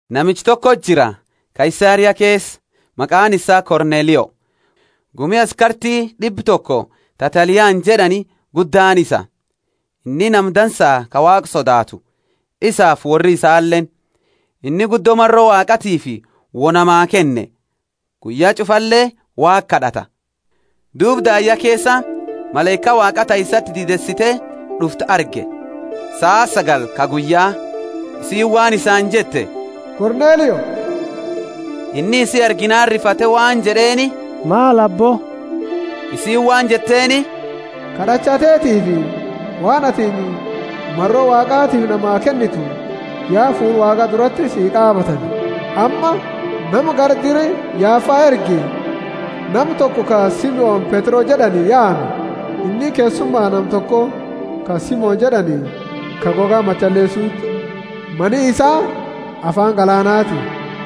Namicha toko jira, Kaisaria keesa, maqaani isaa Kornelio; gumi askarti d'ibba toko ta Taliana jed'ani guddaani isa. Inni nama dansaa ka Waaqa sodaatu, isaafi worri isaaleeni. Inni guddo maro Waaqatiifi wo namaa kenne, guyya ch'ufale Waaqa kad'ata. Duuba daayya keesa malaika Waaqa ta isati diideesite d'uftu arge, saa sagali ka guyya. Isiini waan isaani jette, Kornelio! Inni isi arginaani rifate waan jed'eeni, Maal, Aabbo? Isiini waan jetteeni, Kad'acha teetiifi waan atini maro Waaqatiifi namaa kennitu ya fuula Waaqa durati si qaabatani. Amma nama gara dira Yafa ergi, nama toko ka Simoni Petro jed'ani yaami. Inni keessuma nama toko, ka Simoni jed'ani, ka goga machaleesuti; mani isaa afaani galaanati.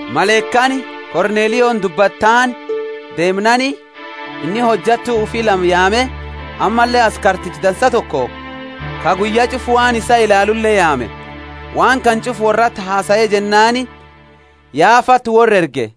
Malaikaani Kornelioni dubbatte taani deemnaani, inni hojattu ufi lama yaame, ammalle askarticha dansa toko ka guyya ch'ufa waan isaa ilaalule yaame. Waan kana ch'ufa worrati hasae jennaani Yafati worra erge.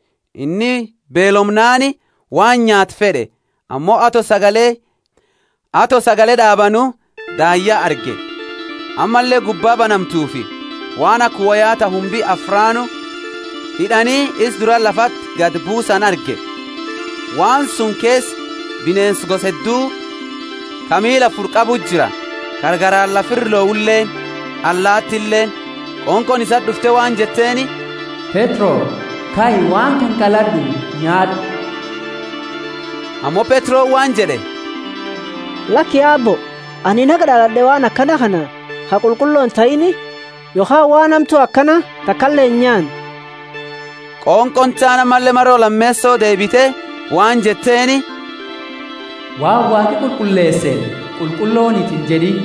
Inni beelomnaani waan nyaatu fed'e; ammo ato sagale d'aabanu, daayya arge. Ammalle gubba banamtufi waan aka woya ta humbi afraanu hid'ani isa dura lafati gadi buusani arge. Waan suni keesa bineensa gosa heddu, ka miila afuri qabuti jira, ka garaani lafa ira lohuleeni, allaatileeni. Qonqooni isati d'ufte waan jetteeni, Petro, kai, waan kana qalad'u nyaad'u. Ammo Petroni waan jed'e, Laki Aabbo, anini haga d'alad'e waan akana kana ka qulqullo intahiini yokhaani waan hamtu akana takale inyaanne. Qonqooni taani ammalle maro lameeso deebite waan jetteeni, Waan Waaqi qulqulleeseeni, Qulqulloniti injed'iini.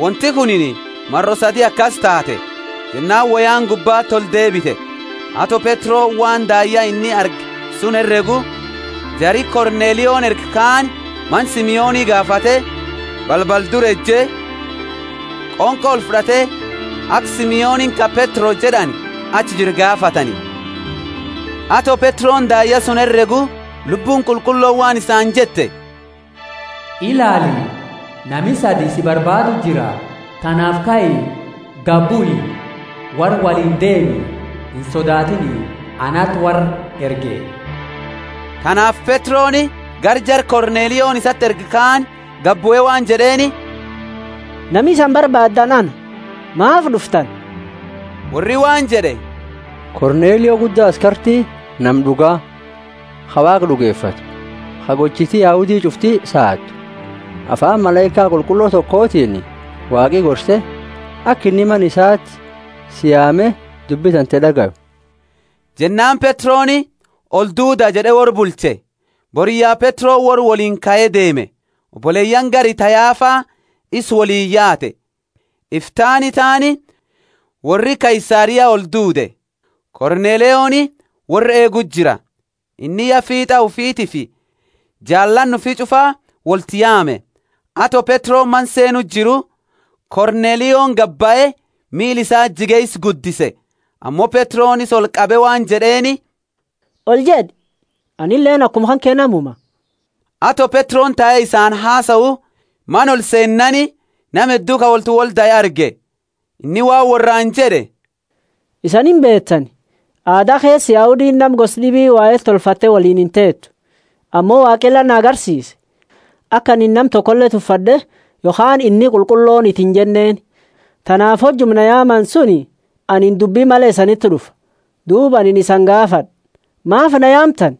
Wonti kunini maro sadi akasi taate, jennaani woyaani gubbati oldeebite. Ato Petroni waan daayya inni arge suni heregu, jari Kornelioni erge kaani mana Simoni gaafate, balbala dura eje, qonqo olfud'ate aka Simoni ka Petro jed'ani achi jiru gaafatani. Ato Petroni daayya suni heregu, Lubbuuni Qulqullooni waan isaani jette, Ilaali, nami sadi sii barbaadu jira, tanaafi kai, gadi bui, worra woliini deemi, insodaatini; anati worra erge. Tanaafi Petroni gara jara Kornelioni isati erge kaani gadibue waan jed'eeni, Nami isani barbaadani ana; maafi d'uftani? Worri waan jed'e, Kornelio gudda askarti, nama d'uga, ka Waaqa d'ugefatu, ka gochiti Yahudi ch'ufti saadu, afaani malaika qulqullo tokotiini Waaqi gorse, aka inni mana isati si yaame dubbi tante d'agayu. Jennaani Petroni, Olduuda jed'e worra bulche. Boriyya Petroni worra woliini kae deeme, oboleyaani gari ta Yafa isa woliini yaate. Iftaani taani worri Kaisaria olduude. Kornelioni worra eeguu jira; inni ya fiit'a ufitiifi jaalaani ufi ch'ufa wolti yaame. Ato Petroni mana seenu jiru, Kornelioni gadi bahe miila isati jige isa guddise. Ammo Petroni isa olqabe waan jed'eeni, Oljed'i, anileeni akuma kanke namuma. Ato Petroni tae isaani hasau, mana olseennaani nama heddu ka woltiwoldae arge. Inni waan worraani jed'e, Isani imbeetani, aada keesa Yahudiini nama gosa d'ibi wahela tolfatte woliini inteetu. Ammo Waaqi la na garsiise, aka anini nama tokole tuffad'e yokhaani, Inni qulqulloniti injenneeni. Tanaafi hojuma na yaamani suni anini dubbi male isaniti d'ufe; duuba anini isani gaafad'a maafi na yaamtani?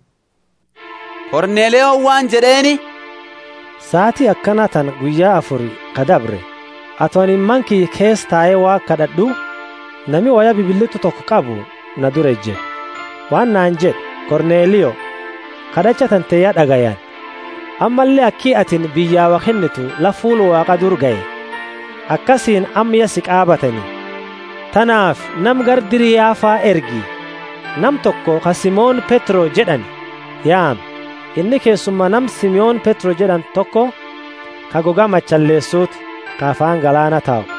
Kornelioni waan jed'eeni, Saati akana tana guyya afuri ka dabre, ato anini mana kiyya keesa tae Waaqa kad'ad'u nami woya bibilit'u toko qabu na dura eje. Waan naani jed'e, Kornelio, kad'acha tante ya d'agayani, ammalle aki atini biyya wo kennitu la fuula Waaqa dura gahe, akasiini amma ya si qaabatani. Tanaafi nama gara dira Yafa ergi, nama toko ka Simoni Petro jed'ani yaami, inni keessuma nama Simoni jed'ani toko ka goga machaleesuti, ka afaani galaana tau.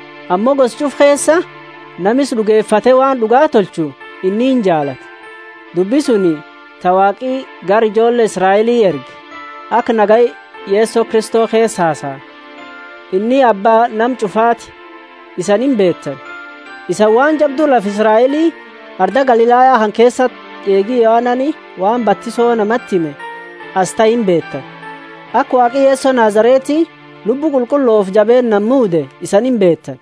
Ammo gosa ch'ufa keesa nama isa d'ugefate waan d'uga tolchu inni injaalata. Dubbi suni ta Waaqi gara ijoolle Israeli erge, aka nagaya Yeso Kristo keesa hasaani, inni Abba nama ch'ufaati, isani imbeetani. Isani waan jabdu lafa Israeli, arda Galilaya kana keesati eegi Yohanani, waan batiso namati hime asi tahe imbeetani, aka Waaqi Yeso Nazareti Lubbu Qulqullofi jabeennaani muude, isani imbeetani.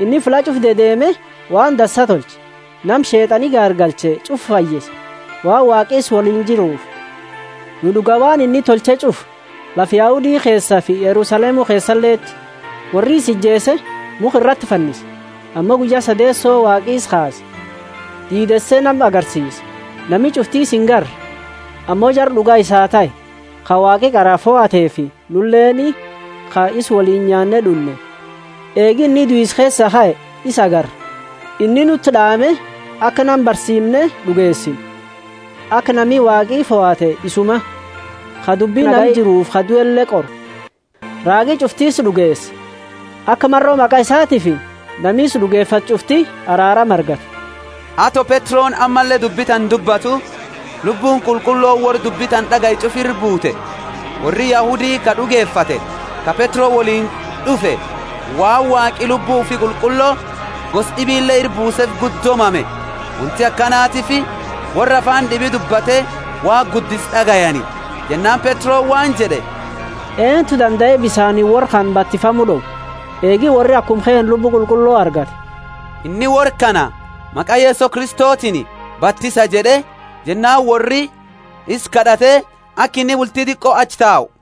Inni fulla ch'ufa dedeeme waan dansa tolche, nama Sheet'ani gaargalche ch'ufa fayyise, waan Waaqi isa woliini jiruufi. Nu d'uga waan inni tolche ch'ufa lafa Yahudi keesafi Yerusalemu keesaleti. Worri isa ijeese, mukha irati fannise. Ammo guyya sadeeso Waaqi isa kaase, diideese nama agarsiise. Nami ch'ufti isa ingarre, ammo jara d'uga isaa tahe, ka Waaqi qara fohateefi nuleeni ka isa woliini nyaanne d'unne, eegi inni duisa keesa kae, isa agarre. Inni nuti d'aame aka nama barsiimne d'ugeesinu, aka nami Waaqi fohate isuma, ka dubbi nama jiruufi ka duele qoru. Raagi ch'ufti isa d'ugeesa, aka maro maqa isatiifi nami isa d'ugefatu ch'ufti araarama argatu. Ato Petroni ammalle dubbi tana dubbatu, Lubbuuni Qulqullooni worra dubbi tana d'agaye ch'ufa ira bute. Worri Yahudi ka d'ugefate ka Petro woliini d'ufe, waan Waaqi Lubbu ufi Qulqullo gosa d'ibile ira buusefi guddo mame. Wonti akanatiifi worra afaani d'ibi dubbate Waaqa guddisu d'agayani. Jennaani Petroni waan jed'e, Eentu dandae bisaaniini worra kana batifamu d'owa, eegi worri akuma keenna Lubbu Qulqullo argate? Inni worra kana maqa Yeso Kristotiini batisa jed'e, Jennaani worri isa kad'ate aka inni bulti diqo achi tau.